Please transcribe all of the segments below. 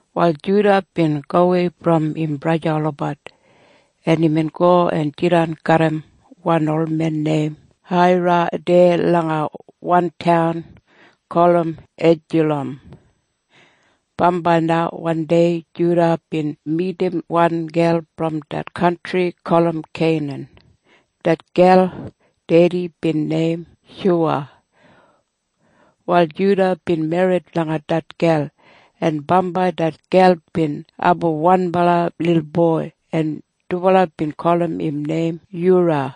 Wal Juda bin gowei brom im braja olabat, en imbin go en jidan garram wan olmen neim Haira deya langa wan taun gulum Edulam. Bambai na wandei Juda bin midim wan gel brom det kantri gulum Keinan. Det gel dedi bin neim Shuwa. Wal Juda bin merrit langa det gel, en bambai det gel bin abum wanbala lilboi, en dubala bin gulum im neim Yura.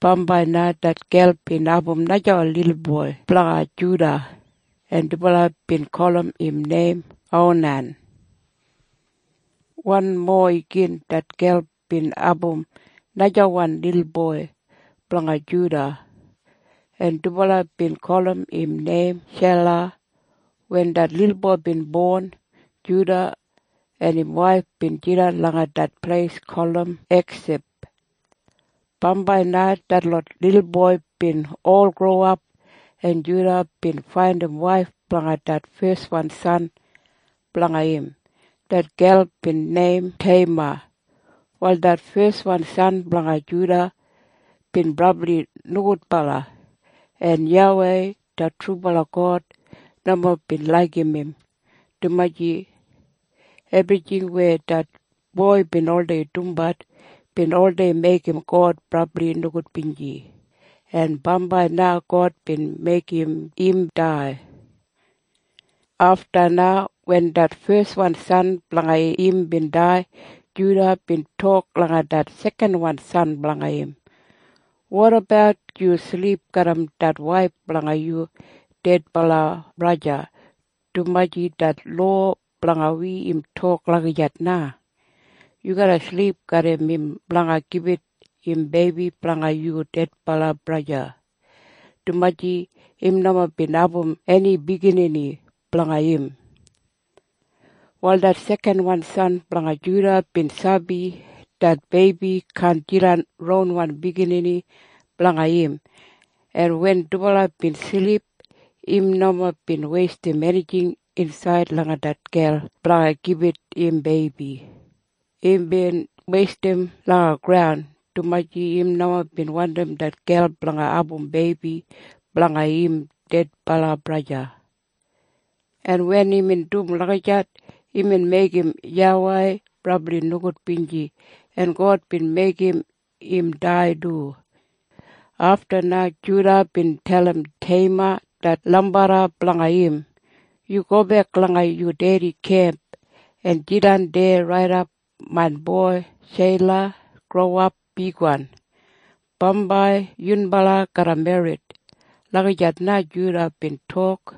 Bambai na det gel bin abum najawan lilboi blanga Juda, en dubala bin gulum im neim Onan. Wanmo igin det gel bin abum najawan lilboi blanga Juda, en dubala bin gulum im neim Shela. Wen det lilboi bin bon, Juda en im waif bin jidan langa det pleis gulum Eksib. Bambai na detlot lilboi bin ol growap, en Juda bin faindim waif blanga det feswan san blanga im. Det gel bin neim Teima. Wal det feswan san blanga Juda bin brabli nogudbala, en YAWEI det trubala God nomo bin laigim im, dumaji ebrijing weya det boi bin oldei dumbat bin oldei meigim God brabli nogudbinji, en bambai na God bin meigim im dai. Afta na wen det feswan san blanga im bin dai, Juda bin tok langa det sekanwan san blanga im, “Wotabat yu silip garram det waif blanga yu dedbala braja, dumaji det lowa blanga wi im tok lagijat na. Yu garra silip garram im blanga gibit im beibi blanga yu dedbala braja, dumaji im nomo bin abum eni biginini blanga im.” Wal det sekanwan san blanga Juda bin sabi det beibi kaan jidan ronwan biginini blanga im, en wen dubala bin silip, im nomo bin weistim enijing insaid langa det gel blanga gibit im beibi. Imbin weistim langa graun, dumaji im nomo bin wandim det gel blanga abum beibi blanga im dedbala braja. En wen imbin dum lagijat, imbin meigim YAWEI brabli nogudbinji, en God bin meigim im dai du. Afta na Juda bin dalim Teima det lambarra blanga im, “Yu gobek langa yu dedi kemp en jidan deya raidap main boi Shela growap bigwan. Bambai yunbala garra merrit.” Lagijat na Juda bin tok,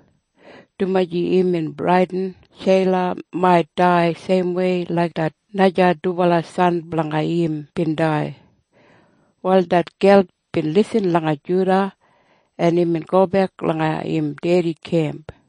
dumaji imbin bradin Shela mait dai seimwei laik det naja dubala san blanga im bin dai. Wal det gel bin lisin langa Juda, en imbin gobek langa im dedi kemp.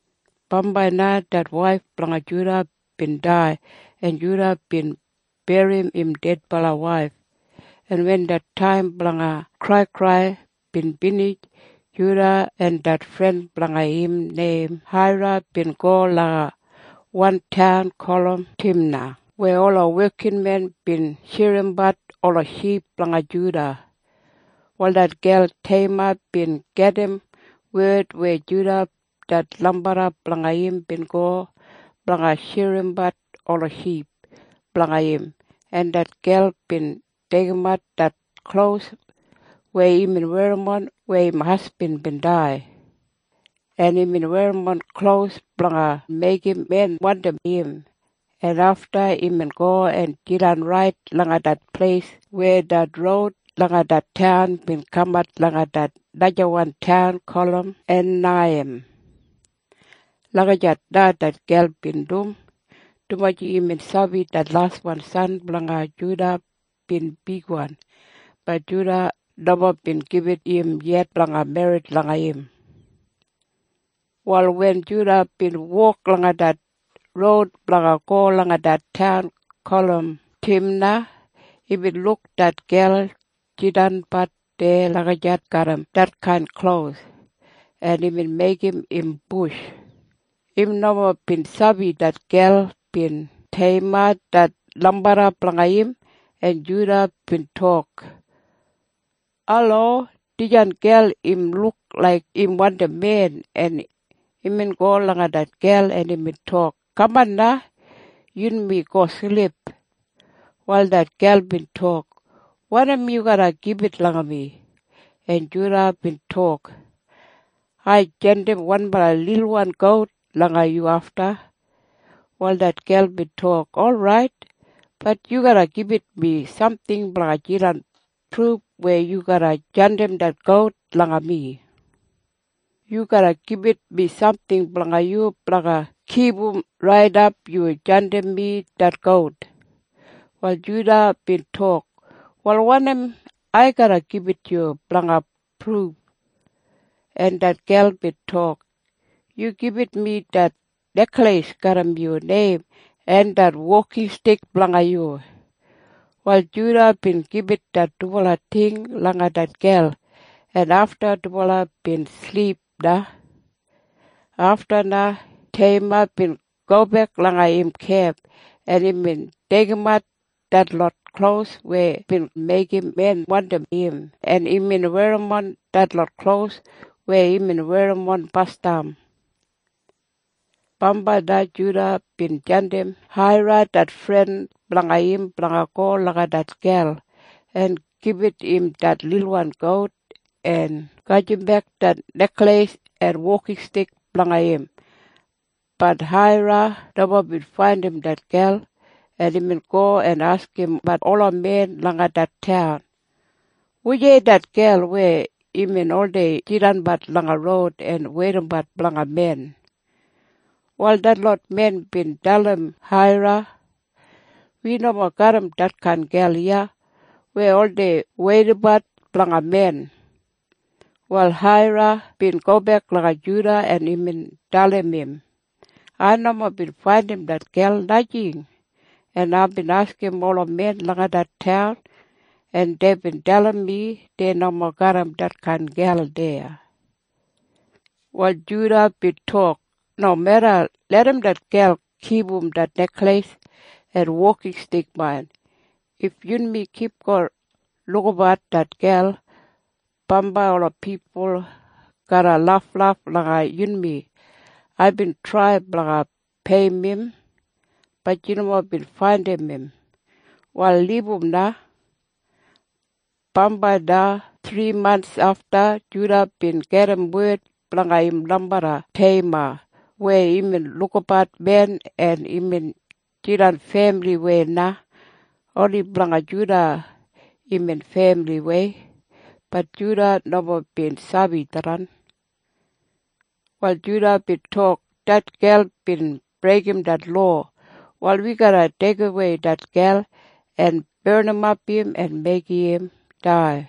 Bambai na det waif blanga Juda bin dai, en Juda bin berrim im dedbala waif, en wen det taim blanga kraikrai bin binij, Juda en det fren blanga im neim Haira bin go langa wan taun gulum Timna weya ola wekinmen bin shirimbat ola ship blanga Juda. Wal det gel Teima bin gedim wed weya Juda det lambarra blanga im bin go blanga shirimbat ola ship blanga im. En det gel bin deigimat det klos weya imbin werrimon weya im hasbin bin dai, en imbin werrimon klos blanga meigim men wandim im, en afta imbin go en jidan rait langa det pleis weya det roud langa det taun bin kamat langa det najawan taun gulum Einaiyim. Lagijat na det gel bin dum, dumaji imbin sabi det laswan san blanga Juda bin bigwan. Bat Juda nomo bin gibit im yet blanga merrit langa im. Wal wen Juda bin wok langa det roud blanga go langa det taun gulum Timna, imbin luk det gel jidanbat deya lagijat garram detkain klos, en imbin meigim im bush. Im nomo bin sabi det gel bin Teima det lambarra blanga im, en Juda bin tok, “Alo! Dijan gel im luk laik im wandim men.” En imbin go langa det gel, en imbin tok, “Kaman na. Yunmi go silip.” Wal det gel bin tok, “Wanim yu garra gibit langa mi?” En Juda bin tok, “Ai jandim wanbala lilwan gout langa yu afta.” Wal det gel bin tok, “Orait. Bat yu garra gibit mi samting blanga jidan pruf weya yu garra jandim det gout langa mi. Yu garra gibit mi samting blanga yu blanga kipum raidap yu jandim mi det gout.” Wal Juda bin tok, “Wal wanim ai garra gibit yu blanga pruf?” En det gel bin tok, “Yu gibit mi det nekleis garram yu neim en det wokinstik blanga yu.” Wal Juda bin gibit det dubala ting langa det gel, en afta dubala bin silip na. Afta na Teima bin gobek langa im kemp, en imbin deigimat detlot klos weya bin meigim men wandim im, en imbin werrimon detlot klos weya imbin werrimon basdam. Bambai na Juda bin jandim Haira det fren blanga im blanga go langa det gel en gibit im det lilwan gout en gajimbek det nekleis en wokinstik blanga im. Bat Haira nomo bin faindim det gel, en imbin go en askimbat ola men langa det taun, “Wujei det gel weya imbin oldei jidanbat langa roud en weidabat blanga men?” Wal detlot men bin dalim Haira, “Wi nomo garram detkain gel iya weya oldei weidabat blanga men.” Wal Haira bin gobek langa Juda, en imbin dalim im, “Ai nomo bin faindim det gel, najing. En aibin askim ola men langa det taun, en deibin dalim mi dei nomo garram detkain gel deya.” Wal Juda bin tok, “Nomeda. Larram det gel kipum det nekleis en wokinstik main. If yunmi kipgon lukabat det gel, bambai ola pipul garra laflaf langa yunmi. Aibin trai blanga peiyim im. Bat yu nomo bin faindim im. Wal libum na.” Bambai na thrimants afta, Juda bin gedim wed blanga im lambarra Teima weya imbin lukabat men, en imbin jidan femiliwei na. Oni blanga Juda imbin femiliwei. Bat Juda nomo bin sabi tharran. Wal Juda bin tok, “Det gel bin breigim det lowa. Wal wi garra deigimwei det gel en barnimap im en meigim im dai.”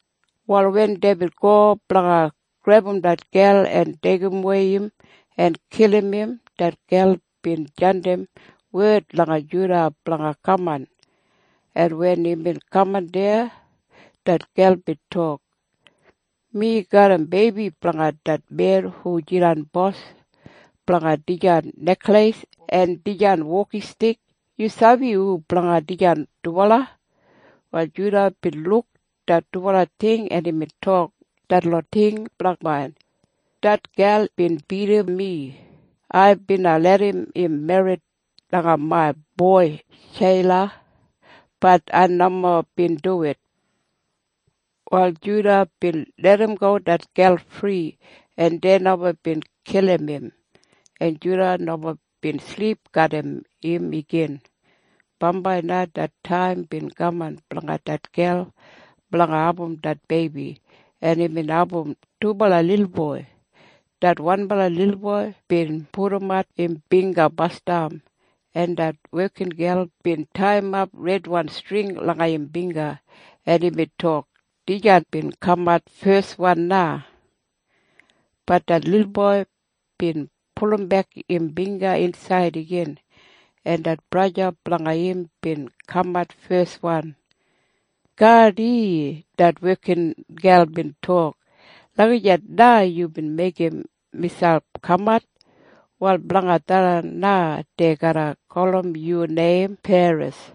Wal wen deibin go blanga grebum det gel en deigimwei im en kilim im, det gel bin jandim wed langa Juda blanga kaman, en wen imbin kaman deya, det gel bin tok, “Mi garram beibi blanga det men hu jidan bos blanga dijan nekleis en dijan wokinstik. Yu sabi hu blanga dijan dubala?” Wal Juda bin luk det dubala ting, en imbin tok, “Detlot ting bla main. Det gel bin bidim mi. Ai bina larram im merrit langa main boi Shela. Bat ai nomo bin duwit.” Wal Juda bin larramgo det gel fri, en dei nomo bin kilim im, en Juda nomo bin silip garram im igin. Bambai na det taim bin kaman blanga det gel blanga abum det beibi, en imbin abum dubala lilboi. Det wanbala lilboi bin pudumat im bingga basdam, en det wekingel bin taiyimap redwan string langa im bingga, en imbin tok, “Dijan bin kamat feswan na.” Bat det lilboi bin pulumbek im bingga insaid igin, en det braja blanga im bin kamat feswan. “Gardi!” Det wekingel bin tok, “Lagijat na yubin meigim miselp kamat! Wal blanga tharran na dei garra gulum yu neim Peres.”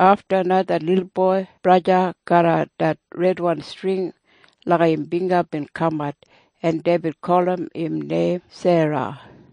Afta na det lilboi braja garram det redwan string langa im bingga bin kamat, en deibin gulum im neim Sera.